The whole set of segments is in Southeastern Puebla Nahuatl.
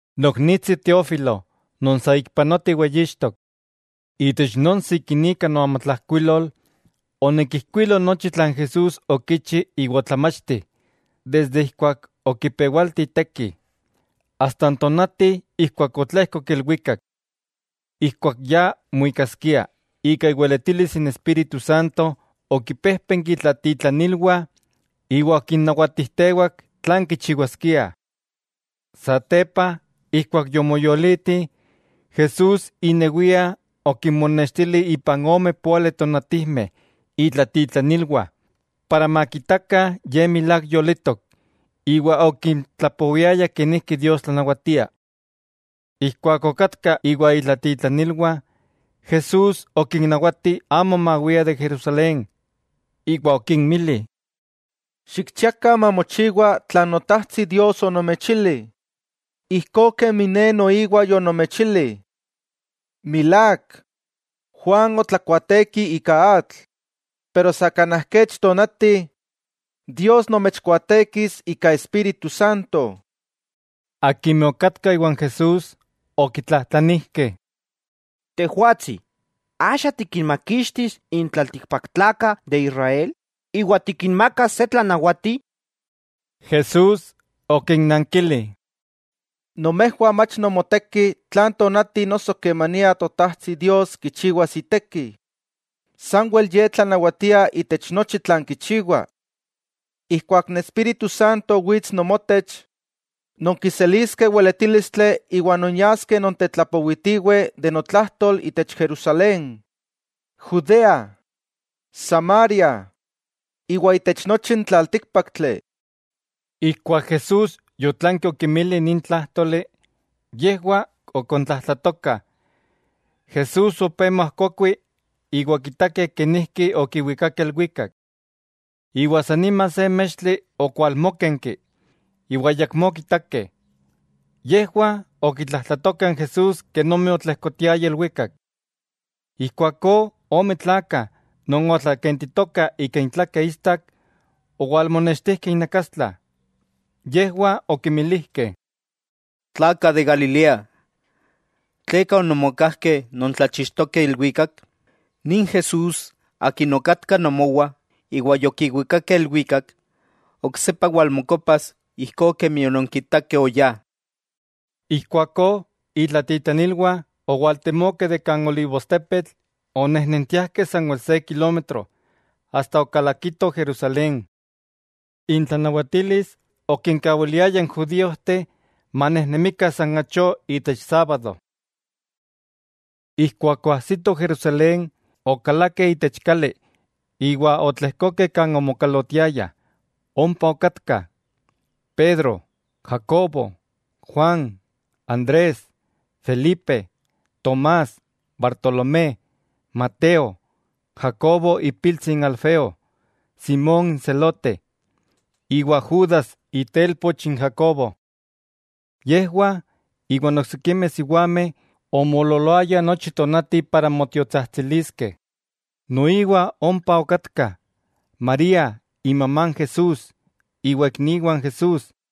Noknitsi Teófilo non saikpanoa tiweyixtok: Itech non sikinika noamatlajkuilol, onikijkuilo nochi tlan Jesús okichi iwa otlamachti desde ijkuak okipewalti iteki, asta n tonati ijkuak otlejkok ilwikak. Ijkuak ya muikaskia, ika iweletilis n Espíritu Santo okimpéjpenki itlatitlanilwah iwa okinnawatijtewak tlan kichiwaskiah. Satepa ijkuak yomoyoliti, Jesús inewia okinmonenextili ipan ome póali tonatijmeh itlatitlanilwah, para makitakah Ye milák yolitok, iwa okintlapowiaya kenijki Dios tlanawatia. Ijkuak okatka iwa itlatitlanilwah, Jesús okinnawati amo mawiah de Jerusalén. Iwa okinmili: —Xikchiakah mamochiwa tlan Notajtsi Dios onomechili, ijkó kemi Ne noiwa yonomechili. Milák, Juan otlakuaateki ika atl, pero sa kanaj kech tonati, Dios nomechkuaatekis ika Espíritu Santo. Akimeh okatkah iwan Jesús, okitlajtlanijkeh: —Tejwatsi, ¿axa tikinmakixtis n tlaltikpaktlakah de Israel iwa tikinmakas se tlanawati? Jesús okinnankili: —Nomejwah mach nomoteki tlan tonati noso kemania Totajtsi Dios kichiwas iteki. Sanwel Ye tlanawatia itech nochi tlan kichiwa. Ijkuak n Espíritu Santo wits nomotech, nonkiseliskeh weletílistli iwa nonyaskeh nontetlapowitiweh notlajtol itech Jerusalén, Judea, Samaria; iwa itech nochi n tlaltíkpaktli. Ijkuak Jesús yotlanki okinmili nin tlájtoli, yejwah ok okontlajtlatokah, Jesús opé moajkokui iwa okitakeh kenijki okiwikakeh ilwikak. Iwa san nima se mextli okwalmókenki, iwa ayakmó okitakeh. Yejwah okitlajtlatokah n Jesús kenomi otlejkotiaya ilwikak. Ijkuakó ome tlakah non otlakentitokah ika intlakeh istak owalmonextijkeh innakastla. Yejwah okimilijkeh: —Tlakah de Galilea, ¿tleka ononmokajkeh nontlachixtokeh ilwikak? Nin Jesús Akin okatka nomowah iwa yokiwikakeh ilwikak, oksepa walmokopas ijkó kemi ononkitakeh oyá. Ijkuakó itlatitlanilwah owaltemokeh de kan olivostepetl onejnentiajkeh sanwel se kilómetro iwa okalakitoh Jerusalén. Intlanawatilis okinkawiliaya n judíojteh manejnemikah san achó itech sábado. Ijkuak oajsitoh Jerusalén, okalakeh itech kali iwa otlejkokeh kan omokalotiaya. Ompa okatka: Pedro, Jacobo, Juan, Andrés, Felipe, Tomás, Bartolomé, Mateo, Jacobo ipiltsi n Alfeo, Simón n Zelote (Kananista) iwa Judas itelpoch n Jacobo. Yejwah iwa oksikimeh siwameh omoololoayah nochi tonati iwa motiotsajtsiliskeh. Noiwa ompa okatkah, María imamá n Jesús iwa ikniwah n Jesús.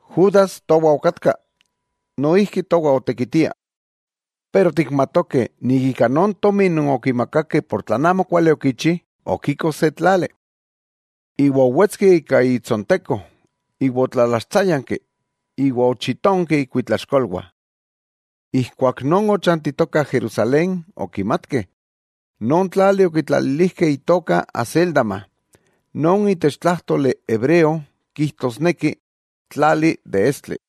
Judas towa okatka, noijki towah otekitia. Pero tikmatokeh ika non tomi non okimakakeh ika tlan amokuali okichi, okiko se tlali. Iwa owetski ika itsonteko iwa otlalaxtsáyanki iwa ochitonkeh ikuitlaxkolwah. Ijkuak non ochantitokah Jerusalén okimatkeh, non tlali okitlalilijkeh itoka Hacéldama, non itech tlájtoli hebreo kijtosneki: Tlali de estli.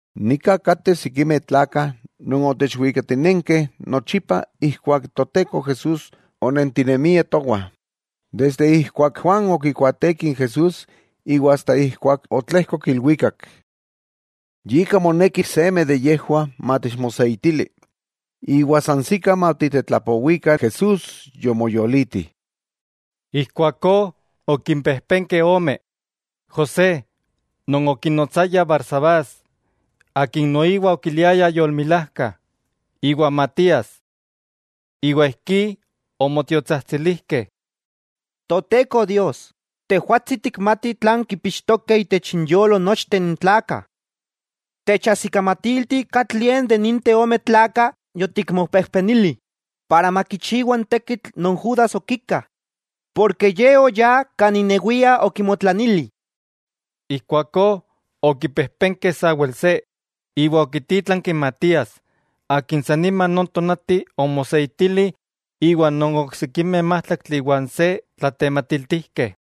'Nika kateh sikimeh tlakah non otechwikatinenkeh nochipa ijkuak n Toteko Jesús onentinemia towah, desde ijkuak Juan okikuaateki n Jesús iwa asta ijkuak otlejkok ilwikak. Yika moneki seme de yejwah matechmoseitili, iwa sansikah matitetlapowikah Jesús yomoyoliti. Ijkuakó okimpejpenkeh ome: José non okinotsayah Barsabás, akin noiwa okiliayah Yolmilajka, iwa Matías. Iwa ijkí omotiotsajtsilijkeh: —Toteko Dios, Tejwatsi tikmati tlan kipixtokeh itech inyolo nochteh n tlakah. Techajsikamatilti katlie de ninteh ome tlakah yotikmopejpenili, para makichiwa n tekitl non Judas okika, porke ye oyá kan inewia okimotlanili. Ijkuakó okipejpenkeh sawel se, iwa okítlanki Matías, akin san nima non tonati omoseitili iwa oksikimeh májtlaktli iwa n se tlatematiltijkeh.